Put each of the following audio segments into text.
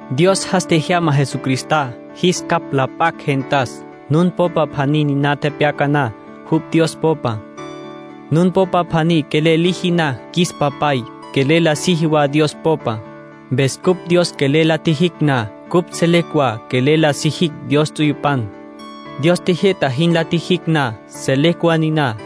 Dios jas tjejyama Jesucristá, jis capj la p'acj gentas. Nun popa pjaní niná tepyona na, jupj Dios popa. Nun popa pjaní quelel liji na qjuis Papay, quelel la siji wa Dios popa. Mpes cupj Dios quelel la tjijicj na, cupj selecj wa quelel la sijicj Dios ts'uyupan. Dios tjijyü'ta jin la tjijicj na, selecj wa niná.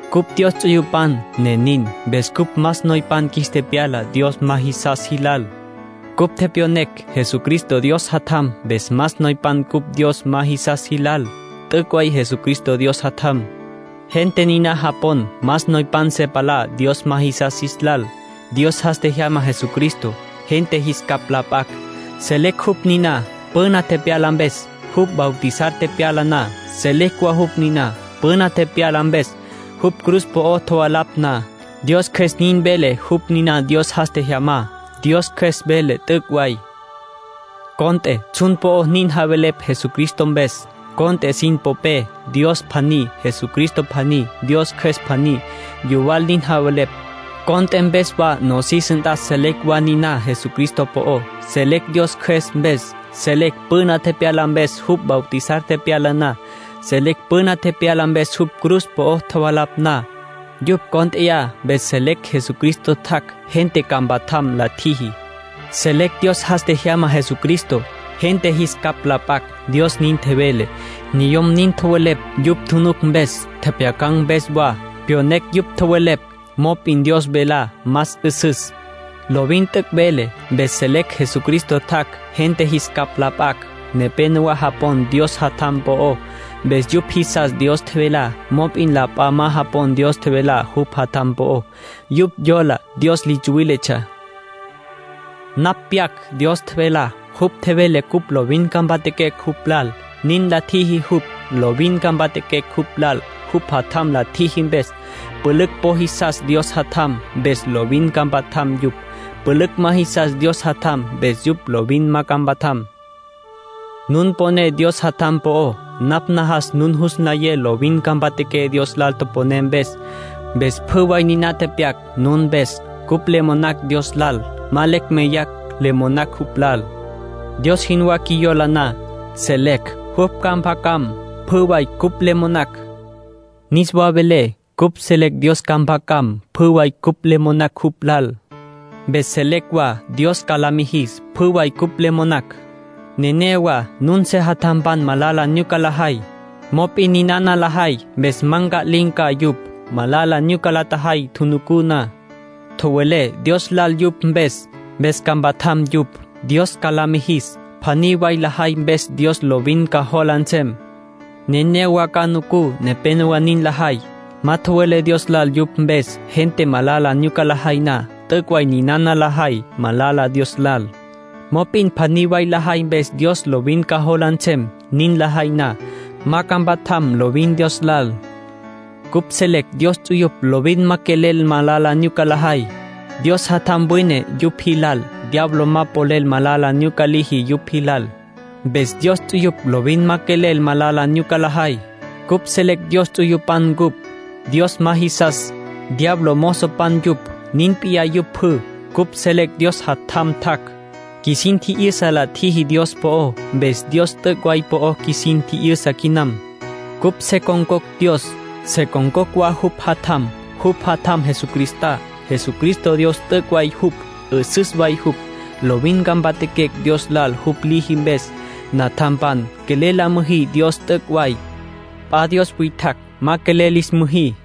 cupj Dios ts'uyupan, ne nin. Mpes cupj más noypan qjuis tepyala Dios ma jisas jilal. Cupj tepyonecj Jesucristo Dios Jatjam. Mpes más noypan cupj Dios ma jisas jilal. T'üc' way Jesucristo Dios Jatjam. Gente niná japon más noypan se palá Dios ma jisas jilal. Dios jas tjejyama Jesucristo, gente jis capj la p'acj. Selecj jupj niná, püna tepyalá mpes, jupj bautizar tepyala na. Selecj wa jupj niná, püna tepyalá mpes, jupj cruz po'ó tjovalapj na. Dios Cjües nin vele jupj niná Dios jas tjejyamá. Dios Cjües vele t'üc' way. Cont'e tsjun po'o nin javelepj Jesucristo mpes. Cont'e sin popé Dios pjaní, Jesucristo pjaní, Dios Cjües pjaní. Yuwal nin javelepj. Cont'e mpes wa nosis nt'a selecj wa niná Jesucristo po'ó. Selecj Dios Cjües mpes. Selecj püna tepyalá mpes jupj bautizar tepyala na. Selecj püna tepyalá mpes jupj cruz po'ó tjovalapj na. Yupj cónt'eya mpes selecj Jesucristo tjac' gente ca mpatjam la tjiji. Selecj Dios jas tjejyama Jesucristo, gente jis capj la p'acj. Dios nin tjevele. Niyom nin tjowelepj yupj tjunuc mpes, tjepjyacan̈ mpes wa; pyonecj yupj tjowelepj. Mop'in Dios velá más 'üsüs. Lovin t'üc' vele. Mpes selecj Jesucristo tjac' gente jis capj la p'acj. Nepénowa japon Dios Jatjam po'ó. Mpes yupj jisas Dios tjevelá. Mop'in la p'a ma japon Dios tjevelá jupj Jatjam po'ó. Yupj yola Dios li tsuwíletsja. Napj pyac Dios tjevelá. Jupj tjevele cupj lovin ca mpatjaquecj jupj lal, nin la tjiji jupj. Lovin ca mpatjaquecj jupj lal jupj Jatjam la tjiji mpes. Pülücj po jisas Dios Jatjam. Mpes lovin ca mpatjam yupj. Pülücj ma jisas Dios Jatjam. Mpes yupj lovin ma ca mpatjam. Nun poné Dios Jatjam po'ó. Napj najas nun jus nlayé lovin ca mpatjaqué Dios lal toponé mpes. Mpes pjü way niná tepyac nun mpes. Cupj le monacj Dios lal. Ma lecj meyacj le monacj jupj lal. Dios jinwá qjuiyola na, selecj jupj ca mpjacam pjü way cupj le monacj. Niswa velé, cupj selecj Dios ca mpjacam pjü way cupj le monacj jupj lal. Mpes selecj wa Dios ca la mijis pjü way cupj le monacj. Nenéyawa nun sejatjampan malala nyuca lajay, mop'in ninana lajay mpes ma nca'lin̈ ca yupj. Malala nyuca la tjajay tjunucú na, tjowelé Dios lal yupj mpes. Mpes ca mpatjam yupj, Dios ca la mijis. Pjaní way lajay mpes Dios lovin ca jola nsem. Nenéyawa ca nucú nepénowa nin lajay. Ma tjowelé Dios lal yupj mpes. Gente malala nyuca lajay na, t'üc' way ninana lajay malala Dios lal. Mop'in pjaní way lajay mpes Dios lovin ca jola nsem. Nin lajay na, ma ca mpatjam lovin Dios lal. Cupj selecj Dios ts'uyupj lovin ma quelel malala nyuca lajay. Dios Jatjam wine yupj jilal. Diablo ma polel malala nyuca liji yupj jilal. Mpes Dios ts'uyupj lovin ma quelel malala nyuca lajay. Cupj selecj Dios ts'uyupan ncupj. Dios ma jisas, diablo mozopan yupj. Nin p'iyá yupj pjü. Cupj selecj Dios Jatjam tjac'. Qjuisin tji'yüsa la tjiji Dios po'ó. Mpes Dios t'üc' way po'o qjuisin tji'yüsa quinam. Cupj se con̈cocj Dios, se con̈cocj wa jupj Jatjam. Jupj Jatjam Jesucristá. Jesucristo Dios t'üc' way jupj, 'üsüs way jupj. Lovin ca mpatjaquecj Dios lal jupj liji mpes. Natjampan, quelel la müjí Dios t'üc' way. P'a dios witjacj ma quelel lis müjí.